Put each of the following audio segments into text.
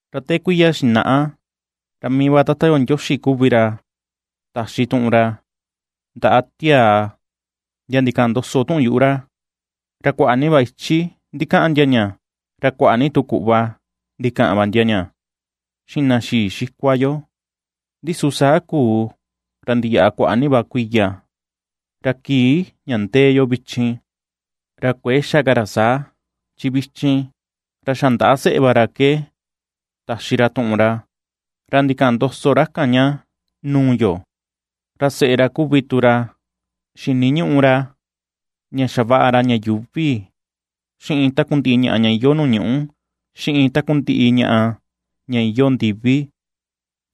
Ra te kuiya xinaꞌa, ra mii va Tata yo Ndioxi kuvi ra taxi tuꞌun ra ndaꞌa tiaa, ndia ndikaꞌan ndoso tuꞌun yuꞌu ra, ra kuaꞌa ni va ichi ndikaꞌan ndia ña, ra kuaꞌa ni tu kuꞌva ndikaꞌan va ndia ña, xiꞌin na xii xikua yo; Ndi su saa kuu, ra ndiyaꞌa kuaꞌa ni va kuiya, ra kii ña ndee yo vichin, ra kuëe xa ka ra saa, chi vichin, ra xa ndaꞌa seꞌe va ra ke taxi ra tuꞌun ra, ra ndikaꞌan ndoso ra kan ña nuu yo. Ra seꞌe ra kuvi tu ra xiniñuꞌu ra ña xavaꞌa ra ña yuuvi, xiꞌin takundiꞌi ñaꞌa ña iyoo nuu ñuꞌu, xiꞌin takundiꞌi ñaꞌa ña iyoo ndiví,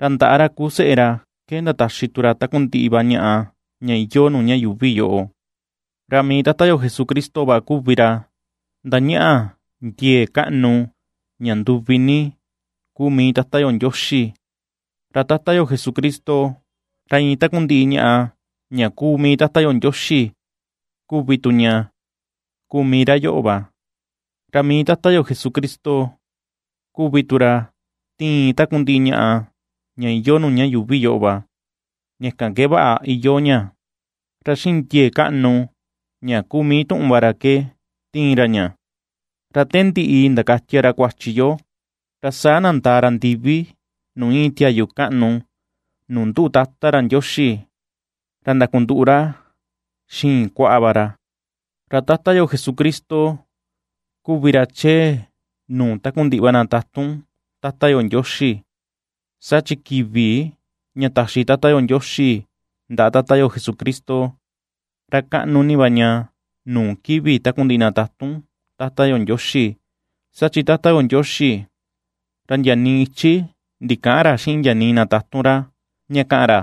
ra ndaꞌa ra kuu seꞌe ra ke ndataxi tu ra takundiꞌi va ñaꞌa ña iyoo nuu ña yuuvi yoꞌo. Ra mii Tata yo Jesucristo va kuvi ra ^ndañaꞌa ndiee kaꞌnu, ña nduvi ni kuu mii Tata yo Ndioxi; ra Tata yo Jesucristo, ra iin takundiꞌi ñaꞌa, ña ^kuu mii Tata yo Ndioxi kuvi tu ña ^kuu mii ra yoꞌo va; ra mii Tata yo Jesucristo kuvi tu ra ^tiin takundiꞌi ñaꞌa ña iyoo nuu ña yuuvi yoꞌo va, ña kan ke vaꞌa iyoo ña; ra xiꞌin ndiee kaꞌnu ña ^kuu mii tuꞌun va ra ke tiin ra ña. Ra te ndiꞌi ndakatia ra kuachi yo, ra saa nandaa ra ndivi nuu íin tiayu kaꞌnu, nuu nduꞌu Tata ra Ndioxi, ra ndakunduꞌu ra xiin kuaꞌa va ra. Ra Tata yo Jesucristo kuvi ra chee nuu takundiꞌi va na tatun Tata yo Ndioxi, saa chi kivi ña taxi Tata yo Ndioxi ndaꞌa Tata yo Jesucristo, ra kaꞌnu ni va ña nuu kivi takundiꞌi na tatun Tata yo Ndioxi. Saa chi Tata yo Ndioxi, ra ndia nii ichi ndikäꞌan ra xiꞌin ndia nii na tatun ra, ña kaꞌan ra,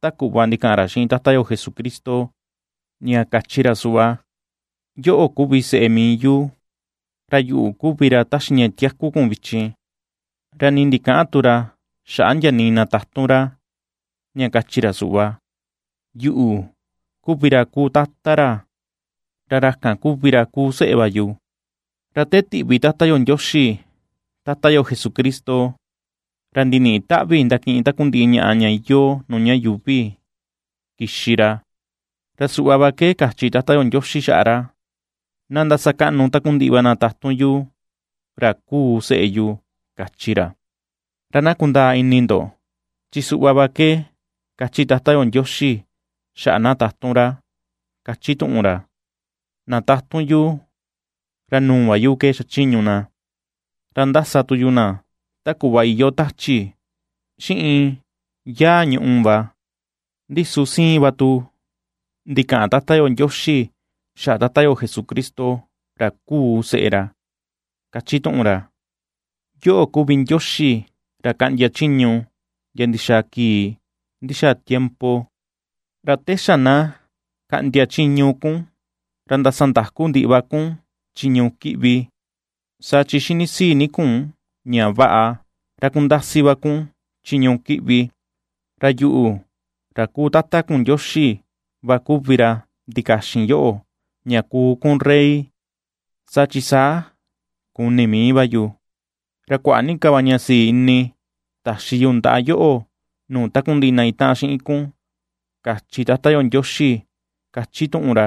ta kuꞌva ndikaꞌan ra xiꞌin Tata yo Jesucristo, ña kachi ra suꞌva: Yoꞌo kuvi seꞌe mii yu; ra yuꞌu kuvi ra ^taxi ña tiaku kun vichin; Ra nii ndikäꞌan tu ra xaꞌa ndia nii na tatun ra, ña kachi ra suꞌva: Yuꞌu kuvi ra kuu Tata ra, ra ra kan kuvi ra kuu seꞌe va yu. Ra te tiꞌvi Tata yo Ndioxi Tata yo Jesucristo, ra ndiniꞌi taꞌvi ndakiꞌin takundiꞌi ñaꞌa ña iyoo nuu ña yuuvi kixi ra, ra suꞌva va ke kachi Tata yo Ndioxi xaꞌa ra: Na ndasakaꞌnu takundiꞌi va na tatun yu, ra kuu seꞌe yu, káchi ra. Ra na kundaa ini ndo, chi suꞌva va ke ^kachi Tata yo Ndioxi, xaꞌa na tatun ra, kachi tuꞌun ra: Na tatun yu, ra nuu va yu ke ^xachiñu na, ra ^ndasa tu yu na ta kuꞌva iyoo tachi, xiꞌin yaa ñùꞌù va. Ndi su siin va tu ndikaꞌan Tata yo Ndioxi xaꞌa Tata yo Jesucristo ra kuu seꞌe ra, kachi tuꞌun ra: Yoꞌo kuvi Ndioxi ra kaꞌndia chiñu ndia ndixaa kii ndixaa tiempo; ra te xa na kaꞌndia chiñu kun, ra ndasandaku ndiꞌi va kun chiñu kiꞌvi. Saa chi ^xinisii ni kun ña vaꞌa, ra kundasi va kun chiñu kiꞌvi; ra yuꞌu, ra kuu Tata kun Ndioxi va kuvi ra ndikaxin yoꞌo, ña kuu kun rey saa chi saa kuni mii va yu, ra kuaꞌa ni ka va ña sii ini, taxi yu ndaꞌa yoꞌo nuu takundiꞌi na itaꞌan xiꞌin kun, kachi Tata yo Ndioxi, ^kachi tuꞌun ra.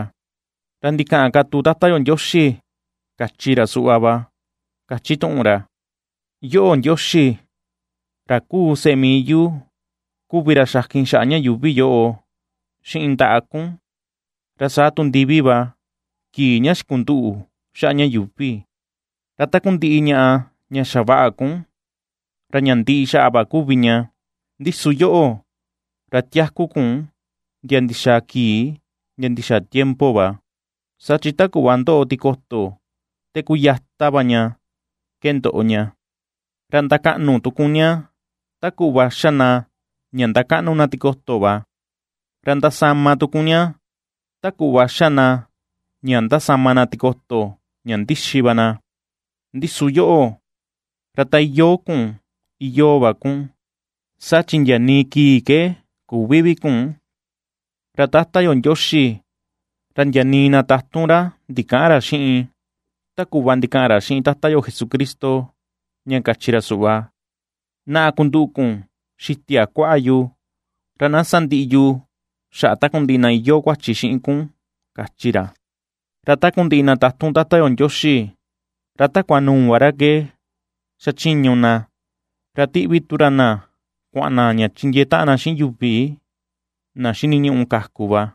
Ra ndikaꞌan ka tu Tata yo Ndioxi, kachi ra suꞌva va, kachi tuꞌun ra: Yoꞌo, Ndioxi, ra kuu seꞌe mii yu kuvi ra xakin xaꞌa ña yuuvi yoꞌo xiꞌin ndaꞌa kun, ra saa tu ndivi va kii ña xikunduꞌu xaꞌa ña yuuvi. Ra takundiꞌi ñaꞌa ña xavaꞌa kun, ra ña ndiꞌi xaꞌa va kuvi ña, ndi su yoꞌo, ra tiaku kun ndia ndixaa kii ndia ndixaa tiempo va. Saa chi ta kuꞌva ^ndoꞌo tikoto te xa kuyata va ña ke ndoꞌo ña; Ra ndakaꞌnu tu kun ña ta kuꞌva xa na ña ^ndakaꞌnu na tikoto va. Ra ndasama tu kun ña, ta kuꞌva xa na ña ^ndasama na tikoto ña ndixi va na. Ndi su yoꞌo, ra ta iyoo kun, iyoo va kun, saa chi ndia nii kii ke küvi vi kun. Ra Tata yo Ndioxi, ra ndia nii na tatun ra ndikäꞌan ra xiꞌin, ta kuꞌva ndikaꞌan ra xiꞌin Tata yo Jesucristo, ña kachi ra suꞌva: Naꞌa kunduꞌu kun xitia kuaꞌa yu, ra na sandiꞌi yu xaꞌa takundiꞌi na iyoo kuachi xiꞌin kun, kachi ra. Ra takundiꞌi na tatun Tata yo Ndioxi, ra takua nuu va ra ke xachiñu na, ra tiꞌvi tu ra na kuaꞌan na ña chindiee taꞌan na xiꞌin yuvi na xiniñuꞌu kaku va.